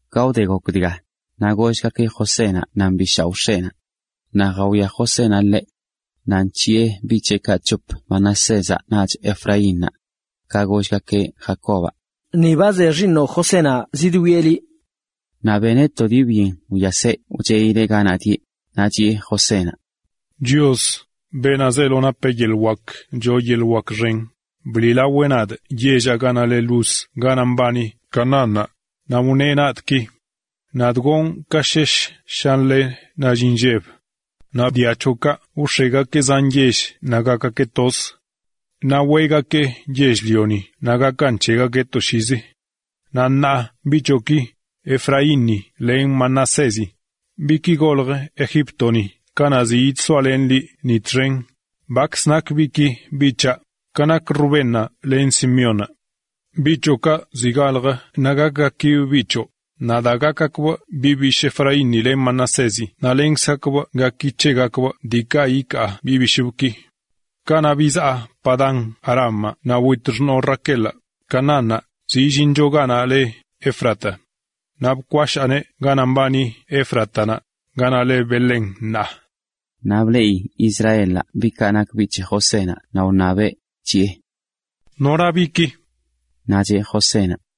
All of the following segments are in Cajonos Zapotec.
Ka wde gok dga, naꞌ gollgakeꞌ Josénaꞌ nan bi shaoꞌ x̱eꞌnaꞌ. Naꞌ jawia Josénaꞌ ḻeꞌ naꞌ nc̱hiꞌe biꞌ c̱heꞌkaꞌ c̱hop Manasézaꞌ naꞌch Efraínnaꞌ. Ka gollgakeꞌ Jacobaꞌ: ―Ni ba ze xiiṉoꞌ Josénaꞌ zidwieꞌ liꞌ. Naꞌ beneꞌ to dii byen wyaseꞌ wcheꞌileꞌ ganaꞌ dieꞌ, naꞌ chiꞌe Josénaꞌ: ―Chios, beenaꞌ zeelo napeꞌ yeḻꞌ wak choo yeḻꞌ wak xen, bliꞌlaweꞌ nadꞌ yell ganaꞌ leꞌ Luz ganaꞌ mbani Canaánnaꞌ, naꞌ wneꞌ nadꞌ ki: “Nadꞌ gonꞌ ka shesh shanle nall inlleb. Naꞌ dia c̱hoꞌkaꞌ wx̱egakeꞌ zan yell naꞌ gakgakeꞌ toz. Naꞌ weꞌgakee yell-lioni naꞌ gakan c̱hegakeꞌ toshiizi.” Naꞌ ṉaa biꞌ c̱hoꞌki, Efraínni len Manasézi, biꞌki goljə Egíptoni kanaꞌ ziꞌ yidsoalenꞌ liꞌ ni txen, bakz nak biꞌki biꞌ c̱haꞌ, ka nak Rubénnaꞌ len Simeónnaꞌ. Biꞌ c̱hoꞌkaꞌ zi galjə naꞌ gakgakibꞌ biꞌ c̱hoꞌ, naꞌ daa gakgakbꞌ biꞌ bishꞌ Efraínni len Manasézi naꞌ lenkzgakbꞌ gaki c̱hegakbꞌ diikaꞌ ikaa biꞌ bishꞌbꞌki. Kanaꞌ bizaa Padán-arámaꞌ naꞌ wit xṉoo Raquelaꞌ Canaánnaꞌ ka zi illincho ganaꞌ leꞌ Efrata. Naꞌ bkwashaaneꞌ ganaꞌ mbani Éfratanaꞌ, ganaꞌ le Belén ṉaa. Naꞌ bleꞌi Israelaꞌ biꞌkaꞌ nak biꞌ c̱he Josénaꞌ naꞌ wṉabeꞌ, chiꞌe: ―¿Nora biꞌki? Naꞌ cheꞌ Josénaꞌ: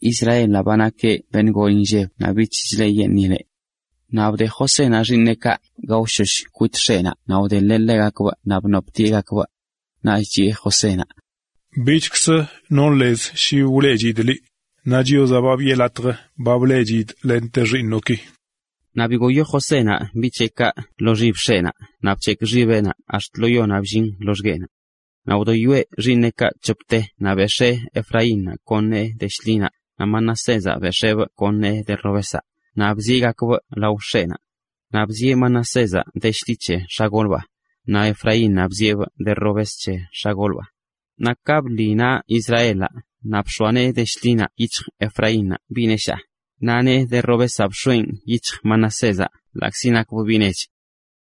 Israel ba nakeꞌ beṉꞌ gol inlleb naꞌ bich chleꞌyeṉꞌileꞌ. Naꞌ bde Josénaꞌ xiiṉeꞌkaꞌ gaoshosh kwit x̱eꞌnaꞌ naꞌ wdeḻeꞌ ḻegakbꞌ naꞌ bnoptieꞌgakbꞌ. Naꞌch chiꞌe Josénaꞌ: ―Bichkzə non lez shi wileꞌchidꞌ liꞌ, naꞌ Chiozaꞌ ba biꞌe latj ba bleꞌchidꞌ lente xiiṉoꞌki. Naꞌ bigoyo Josénaꞌ biꞌ c̱heꞌkaꞌ lo xib x̱eꞌnaꞌ naꞌ bc̱hekꞌ xibeꞌnaꞌ naꞌ ax̱t lo yonaꞌ billin loxgueꞌnaꞌ. Naꞌ wdoyoeꞌ xiiṉeꞌkaꞌ c̱hopte naꞌ bex̱ee Efraínnaꞌ kon nee de shḻinaꞌ, naꞌ Manasézaꞌ bex̱eebꞌ kon nee de robezaꞌ, naꞌ bzieꞌgakbꞌ lao x̱eꞌnaꞌ. Naꞌ bzieꞌ Manasézaꞌ de shḻi c̱he x̱agolbaa, naꞌ Efraínnaꞌ bzieꞌbꞌ de robes c̱he x̱agolbaa. Naꞌ ka bḻi naꞌ Israelaꞌ naꞌ bx̱oa nee de shḻinaꞌ yic̱hj Efraínnaꞌ biꞌ neshaa, naꞌ nee de robezaꞌ bx̱oeꞌn yic̱hj Manasézaꞌ ḻaꞌkzi nakbꞌ biꞌ nech.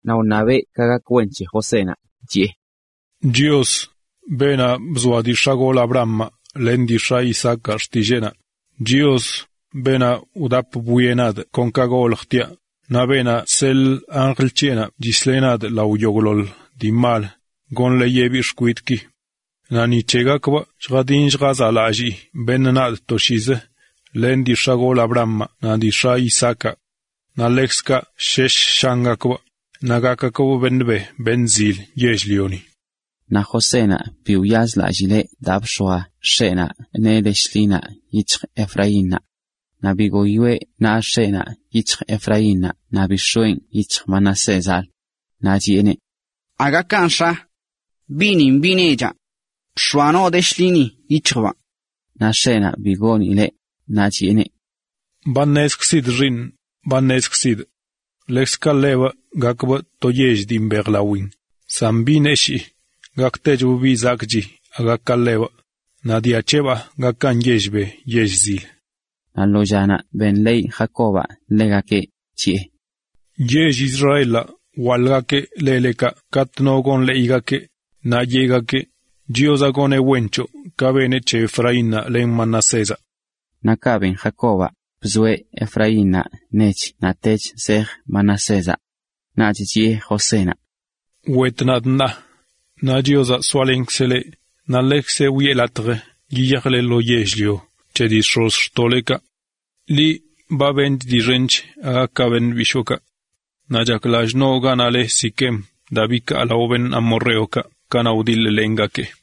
Naꞌ wṉabeꞌ ka gak wen c̱he Josénaꞌ, chiꞌe: “Chios, beenaꞌ bzoa dii x̱agolꞌ Abrahamaꞌ len dii x̱aꞌ Isaacaꞌ xtilleenaꞌ, Chios, beenaꞌ ba wdap bwieꞌ nadꞌ kon ka goljtiaꞌ, naꞌ beenaꞌ chseḻꞌ anjl c̱heꞌnaꞌ chisleꞌ nadꞌ lao yogꞌḻoḻ dii mal goneꞌ ka gak wen c̱he biꞌ xkwidꞌki. Naꞌ ni c̱hegakbꞌ lljadin lljazaꞌlalliꞌ beṉꞌ nadꞌ toshiizi len dii x̱agolꞌ Abrahamaꞌ naꞌ dii x̱aꞌ Isaacaꞌ. Naꞌ ḻekzkaꞌ shesh shangakbꞌ naꞌ gakgakbꞌ beṉꞌ be beṉꞌ zil yell-lioni.” Naꞌ Josénaꞌ bi wyazlallee daa bx̱oa x̱eꞌnaꞌ nee de shḻinaꞌ yic̱hj Efraínnaꞌ. Naꞌ bigoyoeꞌ naꞌ x̱eꞌnaꞌ yic̱hj Efraínnaꞌ naꞌ bix̱oeꞌn yic̱hj Manasézalə. Naꞌ chiꞌeneꞌ: ―¡Aga kanꞌ, x̱a! Biꞌnin biꞌ nechaꞌ. Bx̱oa noo de shḻini yic̱hjbaa. Naꞌ x̱eꞌnaꞌ bi goonileꞌ, naꞌ chiꞌeneꞌ: ―Ba ṉezkzidꞌ, xiiṉꞌ, ba ṉezkzidꞌ. Ḻekzkaꞌ ḻebꞌ gakbꞌ to yell dii mbejlawin, san biꞌ neshii gaktechbꞌ biꞌ zakꞌchi aga ka ḻebꞌ, naꞌ dia c̱heꞌbaa gakan yell be yell zil. Naꞌ lo llanaꞌ wṉab Jacobaꞌ gak wen c̱hegakeꞌ, chiꞌe: ―Yell Israelaꞌ wwaḻꞌgakeꞌ lelekaꞌ katꞌ iṉabgakeꞌ no gak wen c̱hegakeꞌ, naꞌ yeꞌgakeꞌ: “Chiozaꞌ goneꞌ wen c̱hoꞌ ka beneꞌ c̱he Efraínnaꞌ len Manasézaꞌ.” Naꞌ kaꞌ ben Jacobaꞌ, bzoeꞌ Efraínnaꞌ nech naꞌtech zej Manasézaꞌ. Naꞌch chiꞌe Josénaꞌ: ―Wet nadꞌ ṉaa, naꞌ Chiozaꞌ soalenkzeꞌ leꞌ naꞌ ḻekzeꞌ wiꞌe latj yiyajle lo yell-lio c̱he dii x̱ozxtoꞌlekaꞌ. Liꞌ ba beṉchꞌ dii xench aga ka beṉꞌ bishookaꞌ. Naꞌ chak lallꞌ noo ganaꞌ le Siquem daa bikaa lao amorreokaꞌ kanaꞌ wdiḻ-lengakee.